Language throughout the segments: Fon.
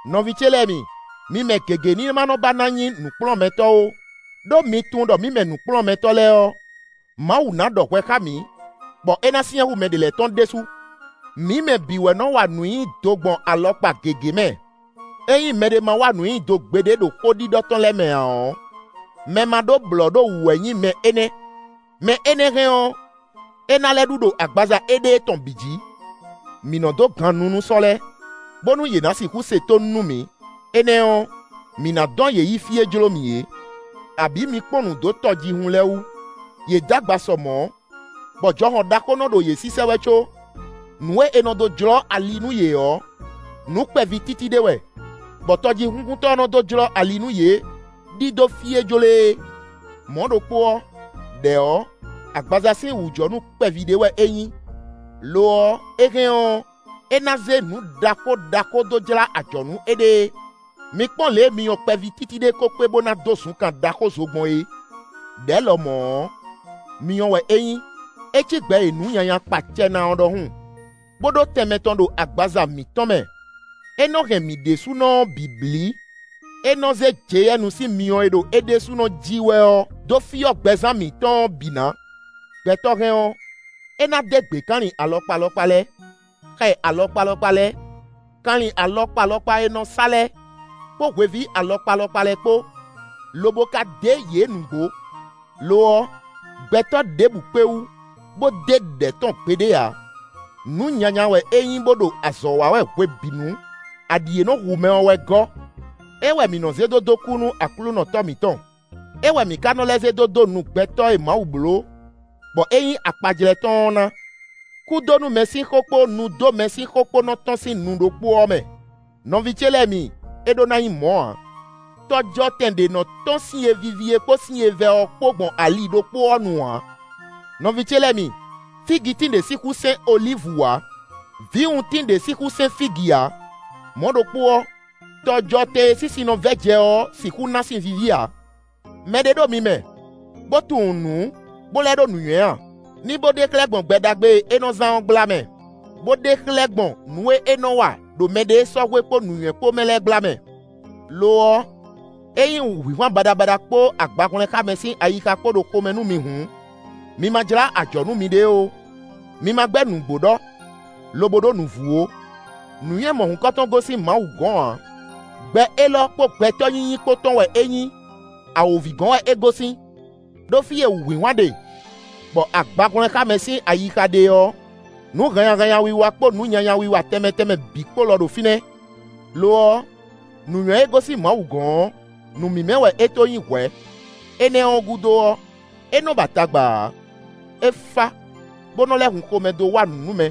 Nɔví ce lɛ́ɛ mi, mi mɛ gěgé ní ma ba ná nyí nǔkplɔ́nmɛtɔ́ ó; ɖó mi tunwun ɖɔ mǐ mɛ nǔkplɔ́nmɛtɔ́ lɛ́ɛ ɔ́, Mawu na ɖɔ hwɛ xá mǐ, bɔ é ná syɛ́n hú mɛ ɖě lɛ́ɛ tɔn ɖésú. Mǐ mɛ bǐ wɛ nɔ wa nǔ nyi do gbɔn alɔkpa gěgé mɛ. Ényí mɛɖé ma wa nǔ nyi do gbeɖé ɖo xó ɖiɖɔ tɔn lɛ́ɛ mɛ ǎ ɔ́, mɛ ma ɖó blɔ̌ ɖo wǔ wɛ nyí mɛ énɛ́; mɛ énɛ́ hɛn ɔ́, é ná lɛ́ ɖu ɖo agbaza éɖée tɔn bǐ jǐ. Mǐ nɔ dó gan nu nú sɔ́ lɛ́ɛ, bónú yě na sixú se tónú nú mǐ; énɛ́ ɔ́, mǐ ná dɔn yě yi fí e jló mǐ é. Abǐ mi kpɔ́n nǔ dó tɔjíhún lɛ́ɛ wú; yě d'agba sɔ mɔ̌, bɔ jɔhɔn ɖaxó nɔ ɖo yě sísɛ́ wɛ có, nǔ e è nɔ dó jlɔ́ ali nú yě ɔ́, nǔ kpɛví títí ɖé wɛ, bɔ tɔjíhúnkuntɔ́ ɔ́ nɔ dó jlɔ́ ali nú yě ɖidó fí e jló e é. Mɔ̌ ɖokpó ɔ́, ɖɛ̌ ɔ́, agbaza sín wǔjɔnú kpɛví ɖé wɛ é nyí; lo ɔ́, é hɛn ɔ́, é ná zé nǔ ɖaxó ɖaxó dó jlá ajɔ̌ nú éɖée. Mi kpɔ́n lě e myɔ kpɛví títí ɖé ko kpé bó ná dó zunkan ɖaxó zo gbɔn é! Đɛ̌ lɔmɔ̌ ɔ́, myɔ wɛ é nyí. É cí gbɛ e nǔ nyanya kpa acɛ ná ɔ́ ɖɔhun, bó ɖó tɛnmɛ tɔn ɖo agbaza mǐtɔn mɛ; é nɔ hɛn mǐ ɖésúnɔ ɔ́ bǐ blí; é nɔ zé jeyɛ́nu sín myɔ e ɖo é ɖésúnɔ ji wɛ ɔ́ dó fyɔ́ gbɛzán mǐtɔn ɔ́ bǐ ná. Gbɛtɔ́ hɛn ɔ́, é ná dé gběkanlin alɔkpa alɔkpa lɛ́ɛ, xɛ alɔkpa alɔkpa lɛ́ɛ, kanlin alɔkpa alɔkpa e è nɔ sá lɛ́ɛ, kpó hweví alɔkpa alɔkpa lɛ́ɛ kpó, lobo ka dé yě nǔgbó. Lo ɔ́, gbɛtɔ́ ɖěbǔ kpé wú, bó dé ɖɛ̌ tɔn gbeɖé ǎ; nǔ nyanya wɛ é nyí bó ɖo azɔ̌ wa wɛ hwebǐnu; aɖǐ e nɔ hu mɛ ɔ́ wɛ gɔ́. É wɛ mǐ nɔ zé dó dó kú nú Aklúnɔ Tɔ́ mǐtɔn; é wɛ mǐ ka nɔ lɛ́ zé dó dó nu gbɛtɔ́ e Mawu bló, bɔ é nyí akpajlɛ́ tɔn ɔ́ ná. Kúdónúmɛ sín xó kpó nudómɛ sín xó kpó nɔ tɔ́n sín nu ɖokpó ɔ́ mɛ. Nɔví ce lɛ́ɛ mi, é ɖó ná nyí mɔ̌ ǎ. Tɔjɔtɛn ɖé nɔ tɔ́n sin e víví é kpó sin e vɛ́ ɔ́ kpó gbɔn ali ɖokpó ɔ́ nu ǎ. Nɔví ce lɛ́ɛ mi, fígitín ɖé sixú sɛ́n olívu ǎ; vǐwuntín ɖé sixú sɛ́n fígi ǎ; mɔ̌ ɖokpó ɔ́, tɔjɔtɛn e sín sin nɔ vɛ́ jɛ ɔ́ sixú ná sin víví ǎ. Mɛ ɖé ɖo mi mɛ, bó tunwun nǔ, bó lɛ́ ɖó nǔnywɛ́ a? Ní bó ɖe xlɛ́ gbɔn gbɛ ɖagbe e é nɔ zán ɔ́ gbla mɛ, bó ɖe xlɛ́ gbɔn nǔ e é nɔ wa ɖo mɛɖée sɔ́ hwe kpó nǔnywɛ́ kpó mɛ lɛ́ɛ gbla mɛ. Lo ɔ́, ényí wǔhwinhwan baɖabaɖa kpó agbahwlɛ́nxámɛ sín ayixa kpó ɖo xomɛ nú mi hǔn, mi ma jlá ajɔ̌ nú miɖée ó; mi ma gbɛ́ nǔgbó ɖɔ, lobo ɖó nǔvú ó. Nǔnywɛ́ mɔ̌hunkɔtɔn gosín Mawu gɔn ǎ; gbɛ élɔ́ kpó gbɛtɔ́ nyínyí kpó tɔn wɛ é nyí; awǒvi gɔ́n wɛ é gosín. Đó fí e wǔhwinhwan ɖe, bɔ agbahwlɛ́nxámɛ sín ayixa ɖe ɔ́, nǔ hannyahannya wiwa kpó nǔ nyanya wiwa tɛnmɛ tɛnmɛ bǐ kpó lɔ ɖo fínɛ́. Lo ɔ́, nǔnywɛ́ e gosín Mawu gɔ́n ɔ́, nǔ mímɛ́ wɛ é to nyí hwɛ̌; énɛ́ ɔ́ gúdo ɔ́, é nɔ ba tagba ǎ; é fá bó nɔ lɛ́ hun xomɛ dó wa nǔ nú mɛ;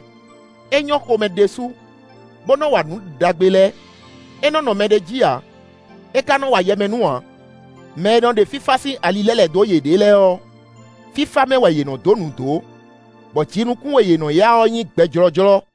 é nyɔ́ xomɛ ɖésú, bó nɔ wa nǔ ɖagbe lɛ́ɛ; é nɔ nɔ mɛɖé jí ǎ; é ka nɔ wa yɛmɛnú ǎ. Mɛ e nɔ ɖe fífá sín ali lɛ́ lɛ̌ dó yěɖée lɛ́ɛ ɔ́, fífá mɛ wɛ yě nɔ dó nǔ dó, bɔ jinukún e yě nɔ ya ɔ́ nyí gbɛ jlɔ́jlɔ́.